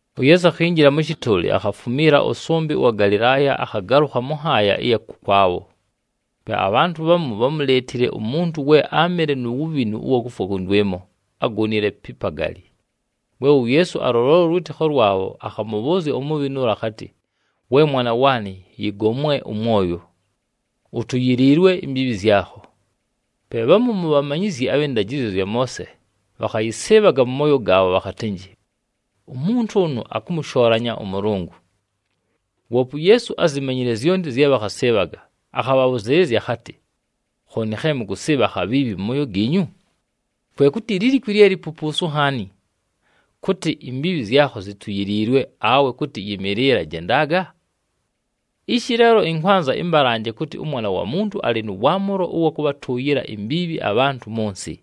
UYeesu akhinjila mʉ shɨtʉʉlɨ, akhafumiila ʉsʉmbɨ ʉwa Galɨlaaya akhagalʉkha mʉ nhaaya ɨya kʉkwabho. Pe abhantʉ bhamu bhámuleetile umuntu we áamɨle nu wubhinu ʉwa kufwa kʉndwɨmo, agonile pi pagali. We uYeesu alʉlola ʉlwɨtɨkho lwabho, akhamʉbhʉʉzya umubhinu ʉla akhatɨ, “We mwana waanɨ, yɨgomwe ʉmwoyo! Utuyiliilwe imbiibhi zyakho.” Pe bhamu mu bhamanyizyi abhɨ ndajɨzyo zya Moose bhakhayɨsɨɨbhaga mʉ mooyo gaabho bhakhatɨnjɨ, “Umuntu ʉnʉ akʉmʉshoolanya ʉMʉlʉngʉ!” Woope uYeesu ázimanyile zyonti zye bhakhasɨɨbhaga, akhabhabhʉzɨɨlɨzya akhatɨ, “Khooni khe mʉkʉsɨɨbha akhabhiibhi mʉ mooyo giinyu? Kwe kʉtɨ lilikwi lye lipupuusu nhaani? Kʉtɨ, ‘Imbiibhi zyakho zituyiliilwe,’ awe kʉtɨ, ‘Yɨmɨɨlɨla, jendaga’? Ishi leelo ɨnkwanza ɨmbalanje kʉtɨ, ʉMwana wa Muntu alɨ nʉ waamʉlo ʉwa kʉbhatʉʉyɨla imbiibhi abhantʉ mʉ nsɨ.”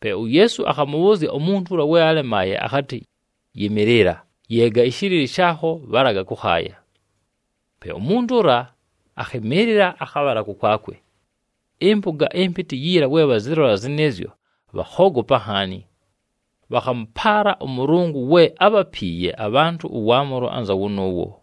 Pe uYeesu akhamʉbhʉʉzya umuntu ʉla we alemaaye akhatɨ, “Yɨmɨɨlɨla, yeega ɨshɨlɨlɨ shaakho, bhalaga kʉkhaaya.” Pe umuntu ʉla akhɨmɨɨlɨla, akhabhala kʉkwakwe. Ɨmpʉga ɨmpɨtɨ yiila we bhazɨlola zɨnɨɨzyo, bhakhoogopa nhaani. Bhakhamʉpaala ʉMʉlʉngʉ we ábhapiiye abhantʉ ʉwaamʉlo anza wʉnʉʉwo.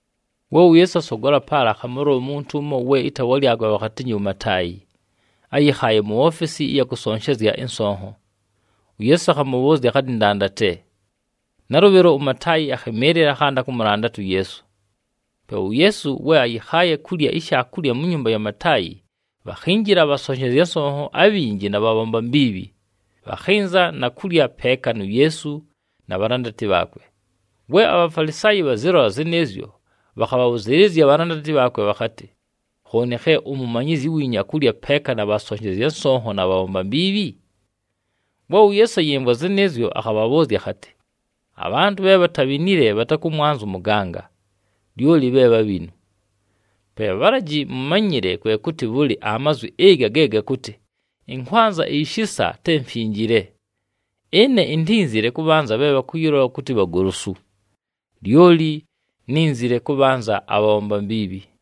We uYeesu asogola paala, akhamʉlola umuntu ʉmo ɨtaawa lyakwe bhakhatɨnjɨ uMataayi, ayɨkhaaye mu ofesi ɨya kʉsonshezya ɨnsonho. UYeesu akhamʉbhʉʉzya akhatɨ, “Ndandate.” Nalʉbhɨlo, uMataayi akhɨmɨɨlɨla, akhanda kʉmʉlandata uYeesu. Pe uYeesu we ayɨkhaaye kulya ishaakulya mu nyumba ya Mataayi, bhakhinjila abhasonshezya nsonho abhinji na bhabhomba mbiibhi, bhakhɨnza na kulya peeka nu Yeesu na bhalandati bhaakwe. We aBhafalisaayi bhazɨlola zɨnɨɨzyo, bhakhabhabhʉzɨɨlɨzya abhalandati bhaakwe bhakhatɨ, “Khooni khe umumanyizyi wiinyu akulya peeka na bhasonshezya nsonho na bhabhomba mbiibhi?” We uYeesu ayɨmvwa zɨnɨɨzyo, akhabhabhʉʉzya akhatɨ, “Abhantʉ bhe bhatabhinile bhatakʉmwanza ʉmʉganga, lyoli bhe bhabhinu. Pe bhalaji mʉmanyɨle kwe kʉtɨ bhʉlɨ amazwi ɨga ge gakʉtɨ, ‘Ɨnkwanza ishisa te mfinjile.’ Ɨne intínzile kʉbhanza bhe bhakʉyɨlola kʉtɨ bhagolosu, lyoli nínzile kʉbhanza abhabhomba mbiibhi.”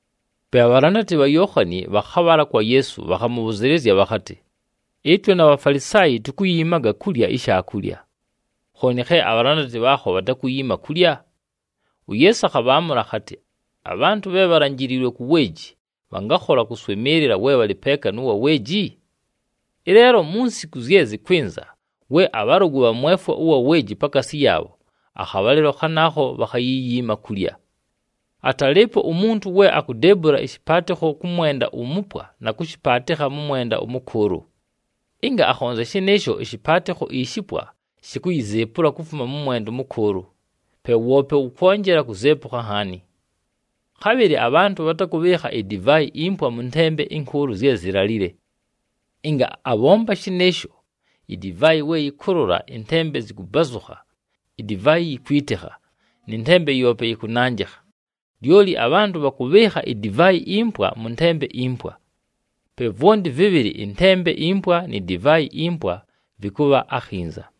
Pe abhalandati bha Yookhani bhakhabhala kwa Yeesu, bhakhamʉbhʉzɨɨlɨzya bhakhatɨ, “Ɨtwe na Bhafalisaayi tukuyiimaga kulya ishaakulya. Khooni khe abhalandati bhaakho bhatakuyiima kulya?” UYeesu akhabhaamʉla akhatɨ, “Abhantʉ bhe bhalanjiliilwe ku weeji, bhangakhola kʉswɨmɨɨlɨla we bhalɨ peeka nʉ wa weeji? Ɨleelo mu nsiku zye zɨkwɨnza, we abhalʉgʉ bhamwefwa ʉwa weeji pakaasi yaabho, akhabhalɨlo khanaakho bhakhayiyiima kulya. Atalɨɨpo umuntu we akudeebula ɨshɨpaatɨkho kʉ mwenda umupwa, na kʉshɨpaatɨkha mʉ mwenda ʉmʉkʉʉlʉ. Ɨnga akhonzya shɨnɨɨsho, ɨshɨpaatɨkho ishipwa, shikuyizeepula kufuma kʉ mwenda ʉmʉkʉʉlʉ, pe woope wʉkwonjela kuzeepukha nhaani. Khabhɨlɨ abhantʉ bhatakʉbhɨɨkha idivaayi impwa mʉ ntembe ɨnkʉʉlʉ zye zilalile. Ɨnga abhomba shɨnɨɨsho, idivaayi we yɨkʉlʉla ɨntembe zɨkʉbazʉkha, idivaayi yikwitikha nɨ ntembe yoope yɨkʉnanjɨkha. Lyoli abhantʉ bhakʉbhɨɨkha idivaayi impwa mʉ ntembe impwa. Pe vwonti vɨbhɨlɨ ɨntembe impwa ni divaayi impwa vɨkʉbha akhinza!”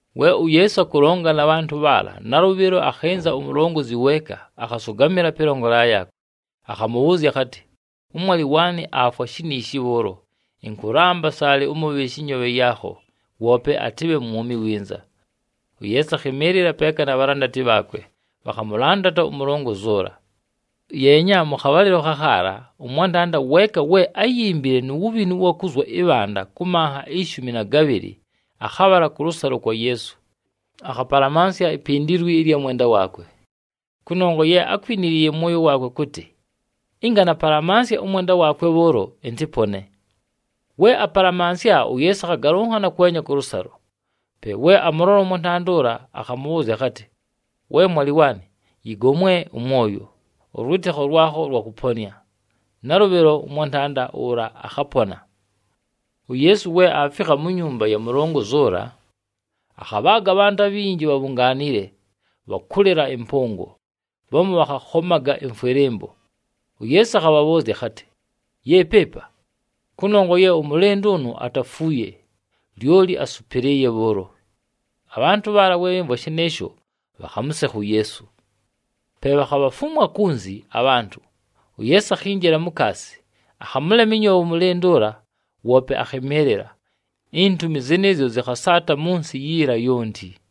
We uYeesu akʉlonga na bhantʉ bhaala, nalʉbhɨlo akhɨnza umulongozi weeka, akhasʉgamɨla pɨlongolela yaakwe, akhamʉbhʉʉzya akhatɨ, “Ʉmwalɨ waanɨ aafwa shiniishi bhʉʉlo. Ɨnkʉlamba, saalɨ ʉmʉbhɨɨshe ɨnyoobhe yaakho, woope atɨbhe mwumi winza.” UYeesu akhɨmɨɨlɨla peeka na bhalandati bhaakwe, bhakhamʉlandata umulongozi ʉla. Yeenya, mʉ khabhalɨlo khakhaala ʉmwantanda weeka we áyimbile nu wubhinu ʉwa kuzwa ɨbhanda kʉ manha ishumi na gabhɨlɨ, akhabhala kʉlʉsalo kwa Yeesu, akhapalamansya ipindilwi ɨlya mwenda waakwe. Kʉnongwa ye ákwinile mʉ mwoyo waakwe kʉtɨ, “Ɨnga napalamansya ʉmwenda waakwe bhʉʉlo, ɨntɨpone.” We apalamansya, uYeesu akhagalʉnhana kwenya kʉlʉsalo. Pe we amʉlola ʉmwantanda ʉla, akhamʉbhʉʉzya akhatɨ, “We mwalɨ waanɨ, yɨgomwe ʉmwoyo! Ʉlwɨtɨkho lwakho lwakʉponɨa!” Nalʉbhɨlo, ʉmwantanda ʉla akhapona. UYeesu we aafikha mu nyumba ya mulongozi ʉla, akhabhaaga abhantʉ abhinji bhabhungaanile, bhakʉlɨla ɨmpʉngo. Bhamu bhakhakhomaga ɨmfwɨlɨmbo. UYeesu akhabhabhʉʉzya akhatɨ, “Yeepi ɨpa! Kʉnongwa ye ʉmʉlɨndʉ ʉnʉ atafuuye, lyoli asʉpɨlɨɨye bhʉʉlo!” Abhantʉ bhaala we bhɨmvwa shɨnɨɨsho, bhakhamʉsekha uYeesu. Pe bhakhabhafumwa kunzi abhantʉ, uYeesu akhinjila mukaasi, akhamʉlema ɨnyoobhe ʉmʉlɨndʉ ʉla, woope akhɨmɨɨlɨla. Intumi zɨnɨɨzyo zɨkhasaata mʉ nsɨ yiila yonti.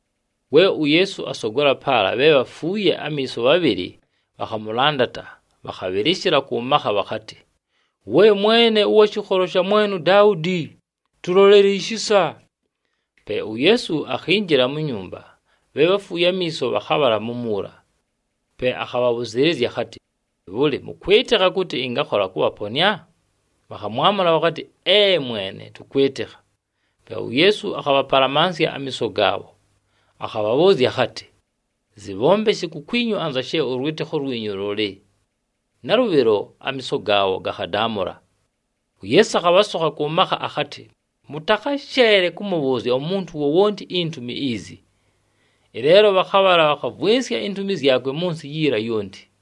We uYeesu asogola paala, bhe bhafuuye amiiso bhabhɨlɨ bhakhamʉlandata, bhakhabhɨlɨshɨla kʉ makha bhakhatɨ, “We Mwene, ʉwa shɨkholo sha mwene uDaudi, tʉlolele ishisa!” Pe uYeesu akhinjila mu nyumba, bhe bhafuuye amiiso bhakhabhala mumuula. Pe akhabhabhʉzɨɨlɨzya akhatɨ, “Bhʉlɨ, mʉkwɨtɨkha kʉtɨ ɨngakhola kʉbhaponɨa?” Bhakhamwamʉla bhakhatɨ, “Ee, Mwene! Tʉkwɨtɨkha.” Pe uYeesu akhabhapalamansya amiiso gaabho, akhabhabhʉʉzya akhatɨ, “Zɨbhombeshe kukwinyu anza she ʉlwɨtɨkho lwinyu lʉlɨ.” Nalʉbhɨlo, amiiso gaabho gakhadaamʉla. UYeesu akhabhasokha kʉ makha akhatɨ, “Mʉtakhasheele kʉmʉbhʉʉzya umuntu wowonti intumi izi!” Ɨleelo bhakhabhala, bhakhavwɨnsya intumi zyakwe mʉ nsɨ yiila yonti.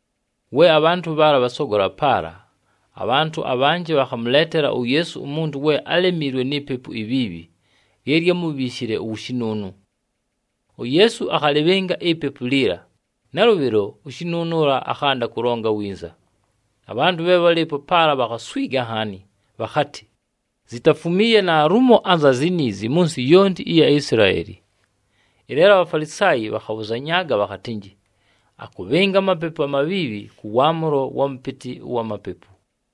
We abhantʉ bhaala bhasogola paala, abhantʉ abhanjɨ bhakhamʉleetela uYeesu umuntu we álemiilwe ni pepu ibhiibhi lye lyámubhiishile uwushinuunu. UYeesu akhalɨbhɨnga ipepu liila, nalʉbhɨlo ushinuunu ʉla akhanda kʉlonga winza. Abhantʉ bhe bhálɨɨpo paala bhakhaswiga nhaani, bhakhatɨ, “Zitafumiiye naalumo anza ziniizi mʉ nsɨ yonti ɨya Isilaeli!” Ɨleelo aBhafalisaayi bhakhabhʉzanyaaga bhakhatɨnjɨ, “Akʉbhɨnga amapepu amabhiibhi kʉ waamʉlo wa mʉpɨtɨ wa mapepu!”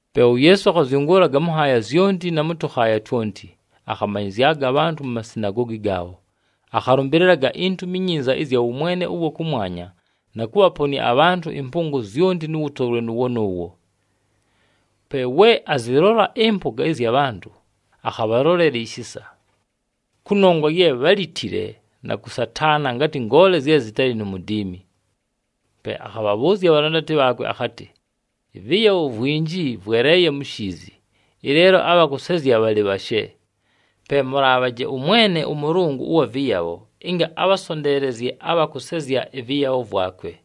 Pe uYeesu akhazyʉngʉʉlaga mʉ nhaaya zyonti na mʉ tʉkhaaya twonti. Akhamanyɨzyaga abhantʉ mu masinagoogi gaabho, akhalʉmbɨlɨlaga iNtumi iNyinza ɨzya wʉmwene ʉwa kʉmwanya na kʉbhaponɨa abhantʉ ɨmpʉngo zyonti nʉ wʉtolwe nʉʉwo nʉʉwo. Pe we azɨlola ɨmpʉga ɨzya bhantʉ, akhabhalolela ishisa. Kʉnongwa ye bhálitile, na kʉsataana, ngatɨ ngoole zye zɨtalɨ nu mudiimi. Pe akhabhabhʉʉzya abhalandati bhaakwe akhatɨ, “Ɨvɨyabho vwinji vweleeye mu shiizi, ɨleelo abha kʉsezya bhalɨ bhashe. Pe mʉlaabhaje ʉMwene ʉMʉlʉngʉ ʉwa vɨyabho, ɨnga abhasonteelezye abha kʉsezya ɨvɨyabho vwakwe.”